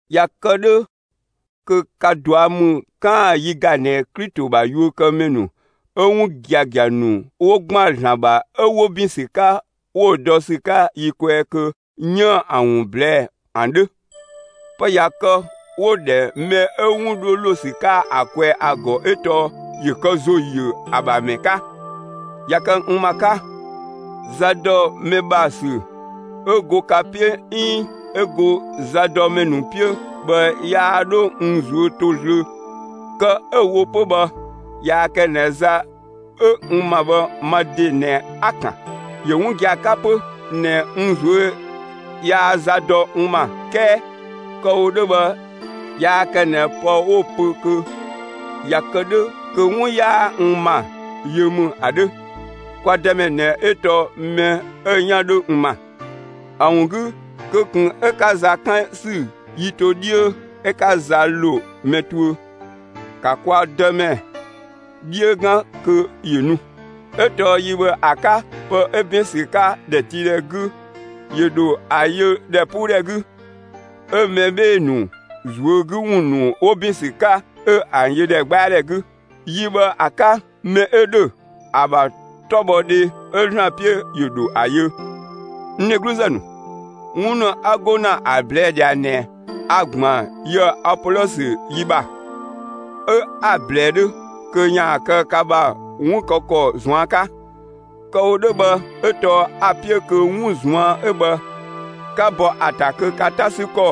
꞊Ya kë 'dhö kö ka ꞊dua' ‑mü 'kaan‑ yi ‑ga ꞊nɛ Klito ‑bha yuökëmɛ ‑nu 'ö 'wun giagia ‑nu 'wo ‑gban ‑Zlan ‑bha 'ö 'wo ‑bin ‑sü 'ka 'wo dɔ ‑sü 'ka yi kwɛɛ kö 'yiën‑ ‑an ‑wun ꞊blɛɛ'‑ ‑an 'dhö. Pë ꞊ya kë 'wo‑ ‑dhɛ mɛ 'ö 'wun 'dho ‑lo ‑sü 'ka ‑a kwɛɛ ‑a ‑gɔ 'ö tɔɔ ‑yö kë ‑zo ‑yö ‑a ‑bha ‑mɛ 'ka. ꞊Ya kë n ‑ma 'ka, za ‑dɔ mɛ ‑bha ‑sü 'ö go ka 'piö 'iin 'ö go zadɔmɛ ‑nu 'piö bhë yaa 'dho n ꞊zuö' 'to zlöö. Kë 'ö‑ wo 'pö bhë yaa kë ꞊nɛ za 'ö n ‑ma bhë ma ‑de ꞊nɛ 'a‑ ‑kan. ‑Yö 'wun gia‑ 'ka 'pö ꞊nɛ n ꞊zuö' yaa za dɔ n ‑ma 'kɛɛ kë‑ wo 'dhö bhë yaa kë ꞊nɛ pë 'wo‑ pö kö ꞊ya kë 'dhö kö 'wun 'yaa n ‑ma yö ‑mü ‑a 'dhö. Kwa Dëmɛ ꞊nɛ 'ö tɔɔ mɛ 'ö‑ 'yan 'dhö n ‑ma. ‑A ‑wun 'gü kö ꞊kun 'ö 'ka za 'kan ‑sü yi to 'dhiö 'ö 'ka za ‑lo mɛ tuö; ‑ka kwa Dëmɛ 'dhiö 'gan kö ‑yö nu; 'ö tɔɔ yi bhë ‑a 'ka pë 'ö ‑bin ‑sü 'ka ‑dhɛtiidhɛ 'gü, ‑yö ‑dho ‑a yö ‑dhɛpuudhɛ 'gü, 'ö mɛ 'bhee‑ ‑nu ꞊zuö' 'gü ‑wun ‑nu 'wo ‑bin ‑sü 'ka, 'ö ‑an yö ‑dhɛgbɛadhɛ 'gü. Yi bhë ‑a 'ka, mɛ 'ö ‑dhö ‑a ‑bha 'tɔbhɔdhe 'ö ‑Zlan 'piö, ‑yö ‑dho ‑a yö. N dhegluzë ‑nu, 'wun ‑nu 'a go ‑na ‑a ꞊blɛɛ' ꞊dhia ꞊nɛ, a‑ ‑gban yië‑ Apolɔsö yi ‑bha 'ö 'a‑ ꞊blɛɛ 'dhö kö ‑yaan kë ka ‑bha 'wun kë ‑kɔ ꞊zuan' 'ka. Kë‑ wo 'dhö bhë 'ö tɔɔ a‑ 'piö kö 'wun ꞊zuan' 'ö bhë 'ka bɔ ‑a ‑ta kö ka 'ta 'sü ‑kɔ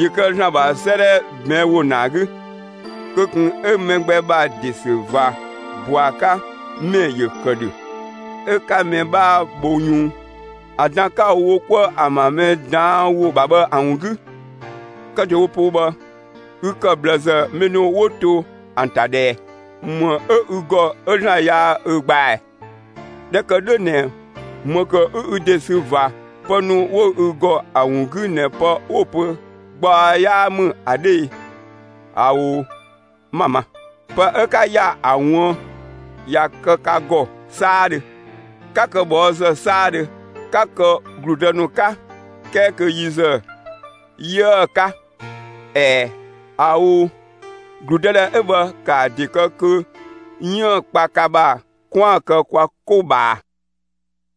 ‑yö kë ‑Zlan ‑bha 'sëëdhɛ ꞊bɛɛn' ‑wo ‑naa 'gü. Kö ꞊kun 'ö mɛ gbɛ ‑bha ‑de ‑sü ꞊va ‑bɔa 'ka ‑mɛ ‑yö ‑kë ‑dhö, 'ö 'ka mɛ 'bhaa bho yunng (‑an dan 'ka‑ wo 'kuë ‑an ‑bha mɛ ꞊daan' ‑wo ‑bha bhë ‑a ‑wun 'gü). Kë ‑dewo poo bhë, ü ‑kë ꞊bhlëzë mɛ ‑nu 'wo to ‑an ‑ta ꞊dhë ꞊ɛ? ‑Më 'ö ü ‑gɔ 'ö ‑Zlan yaa ü gbaa ꞊ɛ? ꞊Dhɛ ‑kë 'dhö ꞊nɛ ‑më ‑kë 'ü ü ‑de sü ꞊va pë ‑nu 'wo ü ‑gɔ ‑a ‑wun 'gü ꞊nɛ pë 'wo‑ pö gbaɔ 'yaa ‑mü ‑a 'dhö e? ꞊Ao, 'ma‑ ma. Pë 'ö 'ka ‑ya ‑a ꞊wuën', ꞊ya kë ka ‑gɔ 'saadhö! 'Ka kë ꞊bhɔɔzë 'saadhö! 'Ka kë ‑gludë ‑nu 'ka, 'kɛɛ kö yi ‑zë 'yiëë‑ 'ka. ꞊Ɛɛ, ꞊ao'! ‑Gludëdhɛ 'ö bhë ‑kaa ‑a ‑de kë kö 'yiën‑ kpa ka ‑bha 'kwaan‑ kë kwa 'ko ꞊bhaa.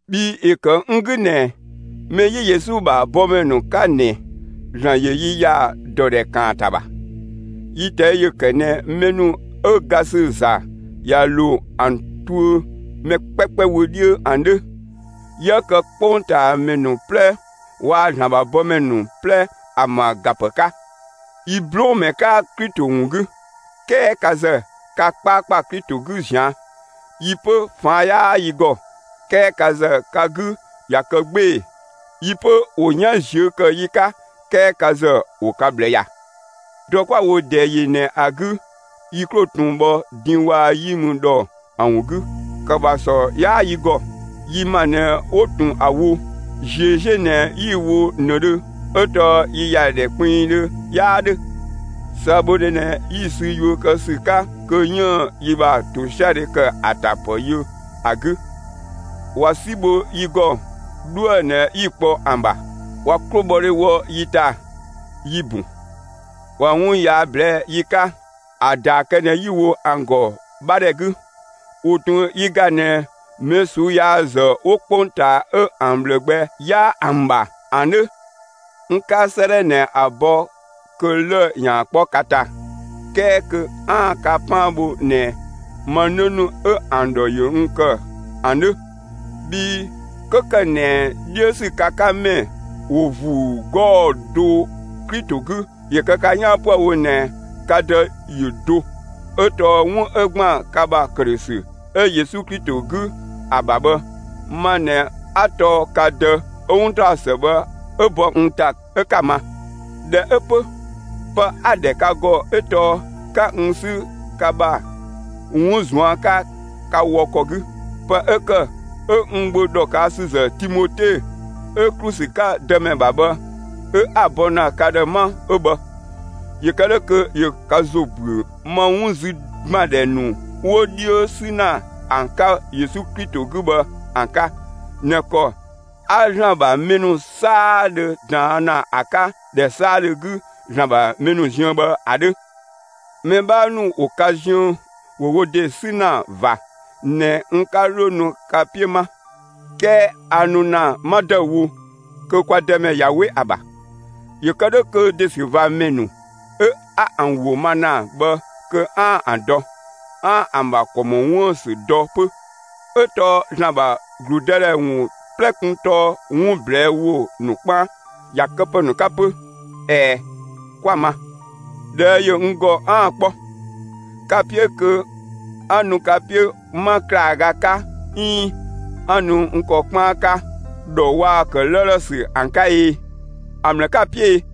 Bhii ‑yö ‑kë n 'gü ꞊nɛ, mɛ 'yi Yesu ‑bha bɔmɛ ‑nu 'ka ꞊nɛ ‑Zlan ‑yö yi ‑ya ‑dɔdhɛ ‑kaanta ‑bha. Yi ꞊tɛi' ‑yö ‑kë ꞊nɛ mɛ ‑nu 'ö ga ‑sü ‑za ꞊ya ‑lo ‑an tuö mɛ 'kpɛkpɛ wö 'dhiö ‑an 'dhö. 'Yië kë 'kpongtaamɛ ‑nu 'plɛ waa‑ ‑Zlan ‑bha bɔmɛ ‑nu 'plɛ ‑an ‑bha ‑ga ‑pë 'ka. Yi 'blɔɔnmɛ 'ka Klito ‑wun 'gü; 'kɛɛ ka ‑zë, ka 'kpaakpa Klito 'gü ꞊zian'; yi 'pö ꞊faan' 'yaa yi ‑gɔ, 'kɛɛ ka ‑zë ka 'gü ꞊ya kë 'gbee‑; yi 'pö, ‑wo 'yan ꞊ziö' ‑kë yi 'ka, 'kɛɛ ka ‑zë ‑wo ka ꞊bhlë ‑ya. Dɔ 'kwa‑ wo ꞊dɛɛ ‑yi ꞊nɛ ‑a 'gü yi 'klo ꞊tun bhɔ din waa‑ 'yi mü ‑dhɔ ‑an ‑wun 'gü; ‑kë ‑bha ‑sɔ 'yaa yi ‑gɔ; yi ‑ma ꞊nɛ 'wo ꞊tun ‑a wo; ꞊ziö' 'ziö ꞊nɛ 'yi‑ wo ꞊nëdhö, 'ö tɔɔ yi ‑ya ‑dhɛ kpinngdhö 'yaa 'dhö. ꞊Sëëbhodhe ꞊nɛ 'yi‑ sü yuö kë ‑sü 'ka kö 'yiën‑ yi ‑bha ‑tosiadhe ‑kë ‑a ‑ta ‑pë yö ‑a 'gü. ꞊Wa 'si bho yi ‑gɔ, 'dhuë‑ ꞊nɛ 'yi‑ kpɔ ‑an ‑bha; ꞊wa 'klobhɔdhe wɔ yi ‑ta, yi‑ ‑bun; ꞊wa 'wun yaa ꞊blɛɛ'‑ yi 'ka, ‑a ‑daa kë ꞊nɛ 'yi‑ wo ‑an ‑gɔ 'bha ‑dhɛ 'gü. ‑Wo ꞊tun yi ‑ga ꞊nɛ mɛ ꞊suu'‑ yaazë 'wo 'kpongtaa 'ö ‑an ꞊bhlë gbɛ 'yaa ‑an ‑bha ‑an 'dhö. N 'ka 'sëëdhɛ ꞊nɛ ‑a bɔ kö lë‑ ‑yaan 'kpɔ ka ‑ta, 'kɛɛ kö 'aan‑ ka 'paan bho ꞊nɛ ma 'në ‑nu 'ö ‑an ‑dhɔ ‑yö n ‑kë ‑an 'dhö. Bhii 'kö ‑kë ꞊nɛ 'dhiö ‑sü ka 'ka ‑mɛ ‑wo ‑vuu 'gɔɔ‑ do Klito 'gü, ‑yö kë ka 'yaan 'püë‑ wo ꞊nɛ ka dë ‑yö do; 'ö tɔɔ 'wun 'ö ‑gban ka ‑bha ‑këdhösü 'ö Yesu Klito 'gü ‑a ‑bha bhë, ma ꞊nɛ 'a tɔɔ ka dë 'ö 'wuntaɔsë bhë 'ö bɔ n ‑ta 'ö 'ka‑ ma. ꞊Dhɛ 'ö 'pö, pë 'a‑ ‑dhɛ ka ‑gɔ 'ö tɔɔ 'ka n 'sü ka ‑bha 'wun ꞊zuan' 'ka ka wɔ ‑kɔ 'gü. Pë 'ö ‑kë 'ö n gbö ‑dhɔkësüzë Timote 'ö ‑klu ‑sü 'ka Dëmɛ ‑bha bhë 'ö 'a‑ bɔ ‑na ka ‑dhë 'ma 'ö bhë, ‑yö kë 'dhö kö ‑yö ka ‑zo ‑büö ma 'wun 'zü ‑gbandhɛ ‑nu 'wo 'dhiö 'sü ‑na n 'ka Yesu Klito 'gü bhë ‑an 'ka ꞊nɛ ‑kɔ 'a ‑Zlan ‑bha mɛ ‑nu 'saadhö ꞊daan' ‑na ‑a 'ka ‑dhɛ 'saadhö 'gü ‑Zlan ‑bha mɛ ‑nu ziën bhë ‑a 'dhö. Mɛ 'bhaa ‑nu 'wo ka ziën ‑wo wo ‑de 'sü ‑na ꞊va ꞊nɛ n 'ka 'dho nu ka 'piö 'ma. 'Kɛɛ a nu ‑na 'ma ‑dëüwo, kö kwa Dëmɛ ꞊ya 'we ‑a ‑bha, ‑yö kë 'dhö kö ‑desüvamɛ ‑nu 'ö 'a ‑an ‑wo ma ‑na bhë kö 'aan‑ ‑an dɔ; 'aan‑ ‑an ‑bha ‑kɔ ‑mɔ 'wuën‑ ‑sü dɔ 'pö, 'ö tɔɔ ‑Zlan ‑bha ‑gludëdhɛ ‑wun 'plɛ kun tɔɔ 'wun ꞊blɛɛ' ‑wo ‑nu 'kpaan, ‑ya këpë ‑nu 'ka 'pö. ꞊Ɛɛ, 'kwa‑ ma. ꞊Dhɛɛ' ‑yö n ‑gɔ 'aan‑ 'kpɔ. Ka‑ 'piö kö 'a nu ka 'piö 'ma ‑klaaga 'ka 'iin 'a nu n ‑kɔ 'kpaan 'ka ‑dhɔ waa‑ ‑kë 'lëëlë ‑sü ‑an 'ka e? (‑A ‑mlë 'ka‑ 'piö e?)